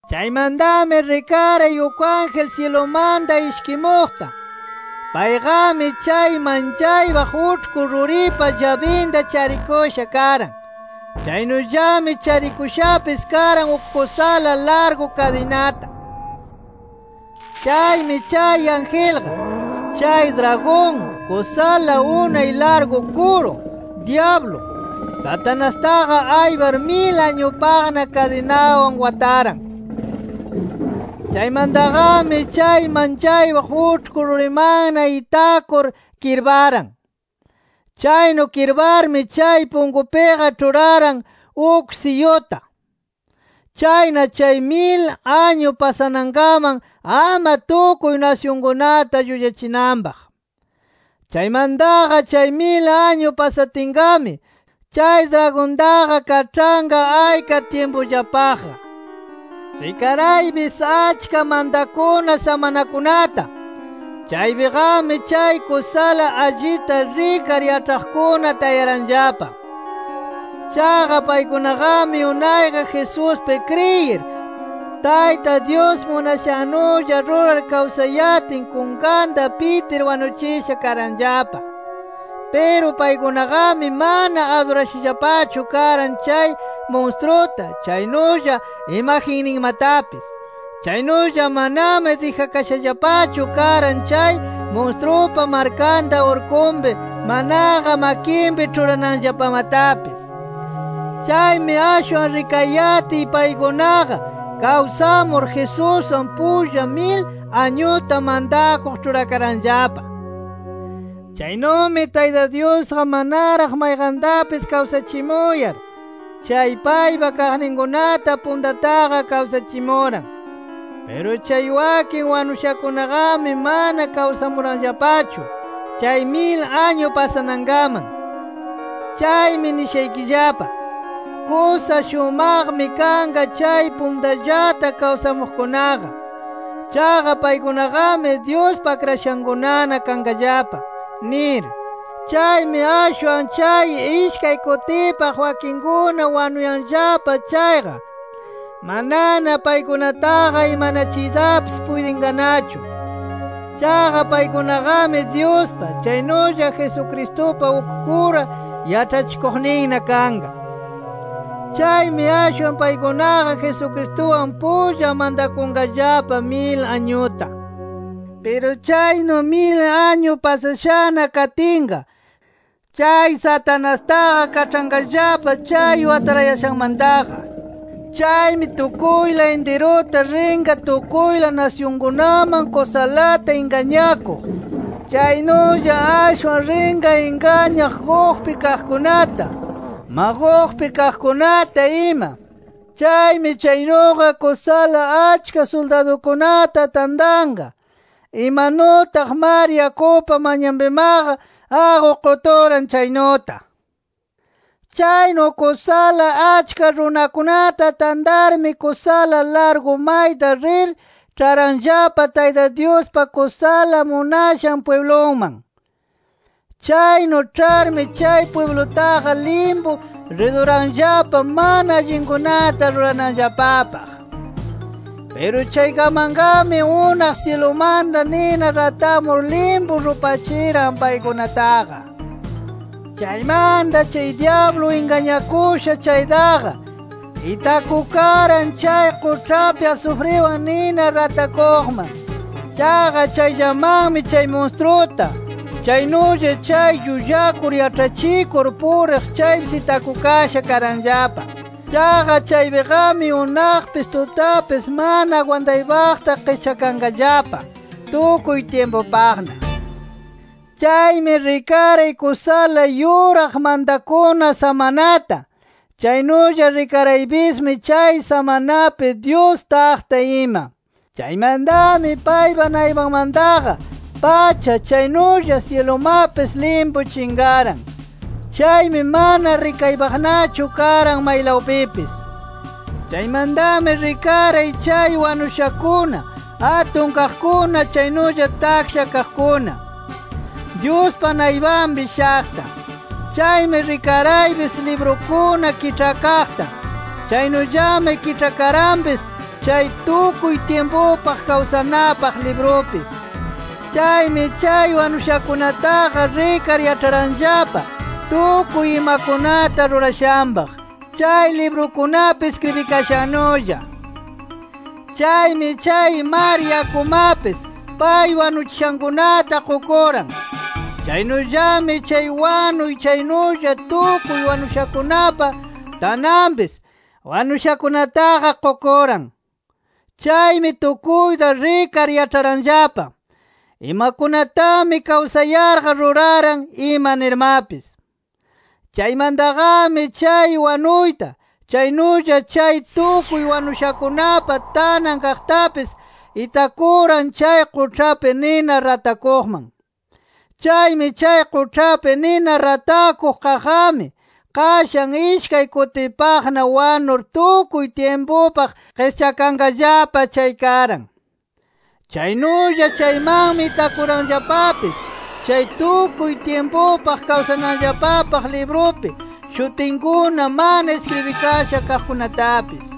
Chaymantami rikaray uk ángel syilumanta ishkimuqta. Payqami chay manchaypaq uĉhku ruripa llabinta charikusha karan. Chaynullami charikushapis karan uk kusala largu kadinata. Chaymi chay angelqa, chay dragon, kusala unay largu kuru, dyablu, Satanastaqa aypar mil añupaqna kadinawan wataran. Chaymantaqami chay manchaypaq uĉhku rurimanna itakur kirparan. Chaynu kirparmi chay punkupiqa ĉhuraran uk siyuta. Chayna chay mil añu pasanankaman ama tukuy nasyunkunata llullachinanpaq. Chaymantaqa chay mil añu pasatinqami, chay dragontaqa kaĉhanqa ayka tyimpullapaqqa. Rikaraypis achka mantakuna samanakunata. Chaypiqami chay kusala allita rikar yaĉhaqkuna tayaranllapa. Chaqa paykunaqami unayqa Jesuspi kriyir Tayta Dyus munashannulla rurar kawsayatin kunkanta pitir wanuchisha karanllapa. Piru paykunaqami mana adurashallapachu karan chay munstruta, chaynulla imagenninmatapis. Chaynulla manami dijakashallapachu karan chay munstrupa markanta urkunpi, manaqa makinpi ĉhurananllapamatapis. Chaymi ashwan rikayatiy paykunaqa kawsamur, Jesuswan pulla mil añuta mantakuq ĉhurakaranllapa. Chaynumi Tayta Dyusqa manaraq mayqantapis kawsachimuyar, chay paypa kaqninkunata puntataqa kawsachimuran. Piru chay wakin wanushakunaqami mana kawsamuranllapachu, chay mil añu pasanankaman. Chaymi nishaykillapa: Kusa shumaqmi kanqa chay puntallata kawsamuqkunaqa. Chaqa paykunaqami Dyuspa akrashankunana kanqallapa nir. Chaymi ashwan chay ishkay kutipaq wakinkuna wanuyanllapa chayqa, manana paykunataqa imanachiytapis puytinqanachu. Chaqa paykunaqami Dyuspa, chaynulla Jesucristupa uk kura yaĉhachikuqninna kanqa. Chaymi ashwan paykunaqa Jesucristuwan pulla mantakunqallapa, mil añuta. Piru chaynu mil añu pasashana katinqa, chay Satanastaqa kaĉhanqallapa chay watarayashanmantaqa. Chaymi tukuyla intiruta rinqa tukuyla nasyunkunaman kusalata ingañakuq. Chaynulla ashwan rinqa ingañaq Gogpi kaqkunata, Magogpi kaqkunata ima. Chaymi chaynuqa kusala achka suldadukunata tantanqa, imanutaq mar yakupa manyanpimaqa aqu quturan chaynuta. Chaynu kusala achka runakunata tantarmi kusala largu mayta rir ĉharanllapa Tayta Dyuspa kusala munashan pwibluman. Chaynu ĉharmi chay pwiblutaqa limpu riduranllapa mana allinkunata rurananllapapaq. Piru chaykamanqami unaq syilumanta nina ratamur limpu rupachiran paykunataqa. Chaymanta chay dyablu ingañakusha chaytaqa, itakukaran chay quĉhapi asufriwan nina ratakuqman. Chaqa chayllamanmi chay munstruta, chaynulla chay llullakur yaĉhachikur puriq chaypis itakukasha karanllapa. Chaqa chaypiqami unaqpis tutapis mana agwantaypaqta qischakanqallapa, tukuy tyimpupaqna. Chaymi rikaray kusala yuraq mantakuna samanata. Chaynulla rikaraypismi chay samanapi Dyus taqta ima. Chaymantami paypa naypanmantaqa, pacha chaynulla syilumapis limpu chinqaran. Chaymi mana rikaypaqnachu karan maylawpipis. Chaymantami rikaray chay wanushakuna atun kaqkuna chaynulla taksha kaqkuna Dyuspa naypanpi shaqta. Chaymi rikaraypis librukuna kiĉhakaqta. Chaynullami kiĉhakaranpis, chay tukuy tyimpupaq kawsanapaq librupis. Chaymi chay wanushakunataqa rikar yaĉharanllapa tukuy imakunata rurashanpaq, chay librukunapi iskribikashannulla. Chaymi chay mar yakumapis, pay wanuchishankunata qukuran. Chaynullami, chay wanuy chaynulla tukuy wanushakunapa tananpis wanushakunataqa qukuran. Chaymi tukuyta rikar yaĉharanllapa, imakunatami kawsayarqa ruraran ima nirmapis. Chaymantaqami chay wanuyta, chaynulla chay tukuy wanushakunapa tanan kaqtapis, itakuran chay quĉhapi nina ratakuqman. Chaymi chay quĉhapi nina ratakuq kaqqami, qashan ishkay kutipaqna wanur tukuy tyimpupaq qischakanllapa chay karan. Chaynulla chaymanmi itakuranllapapis, chay tukuy tyimpupaq kawsanallapapaq librupi shutinkuna mana iskribikasha kaqkunatapis.